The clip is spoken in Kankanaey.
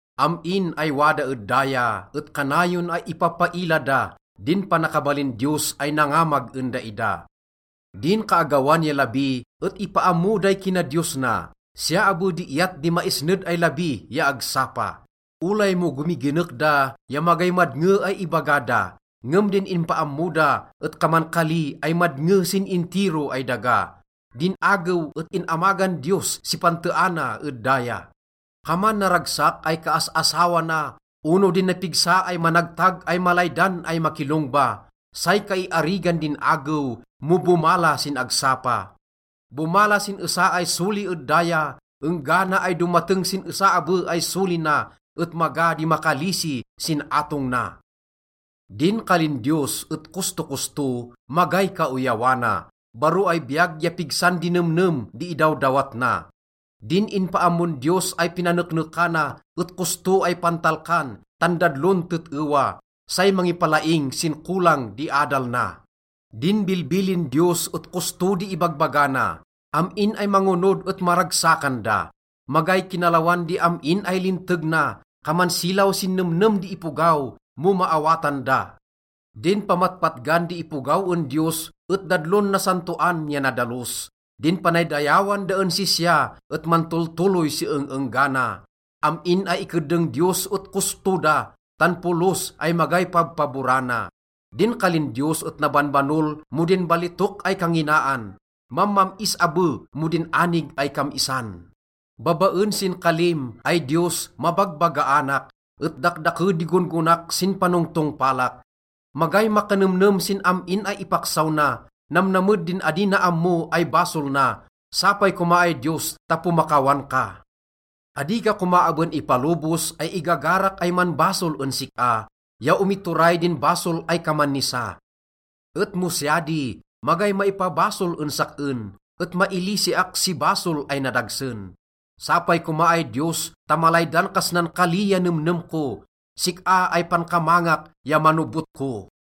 Am-in ay wada ed daya et kanayon ay ipappaila da din panakabalin Diyos ay nangamag en daida. Din kaagawan ya labi et ipaammo day kinadiyos na, siya abe di iyat di maisned ay labi ya agsapa. Olay mo gomiginek da ya magay madnge ay ibaga da, ngem din ipaammo da et kaman kali ay madnge sin intiro ay daga. Din agew et in-amagan Diyos si panteana ed daya. Kaman naragsak ay kaas-asawa na ono din napigsa ay managtag ay malaydan ay makilongba, say kaiarigan din agew mo bomala sin agsapa. Bomala sin esa ay soli ed daya enggana ay domateng sin esa abe ay soli na, et maga di makalisi sin atong na. Din kalin Diyos et kostokosto, magay kaoyawana, baro ay biyag ya pigsan di nemnem di idawdawat na. Din inpaammon Diyos ay pinaneknekana et kosto ay pantalkan tan dadlon tet-ewa. Say mangipalaing sin kolang di adal na. Din bilbilin Diyos et kosto di ibagbaga na, am-in ay mangonod et maragsakan da. Magay kinalawan di am-in ay linteg na, kaman silaw sin nemnem di ipogaw mo maawatan da. Din pamatpatgan di ipogaw en Diyos et dadlon nasantoan ya nadalos. Din panaydayawan da en sisya et mantoltoloy si eng-enggana. Am-in ay ikeddeng Diyos et kosto da tan polos ay magay pabpaborana. Din kalin Diyos et nabanbanol mo din balitok ay kanginaan, mammam-is abe mo din anig ay kam-isan. Babaen sin kalim, ay Diyos, mabagbagaanak, et dakdake di gon-gonak sin panongtongpalak. Magay makanemnem sin am-in ay ipaksaw na, namnamed din adi na ammo ay basol na. Sapay koma ay Diyos ta pomakawan ka. Adi ka koma aben ipalobos ay igagarak ay manbasol en sik-a ya omituray din basol ay kaman nisa. Et mo siya di, magay maipabasol en sak-en, et mailisiak si basol ay nadagsen. Sapay koma ay Diyos ta malaydan kas nan kali ya nemnem ko, sik-a ay pankamangak ya manobot ko.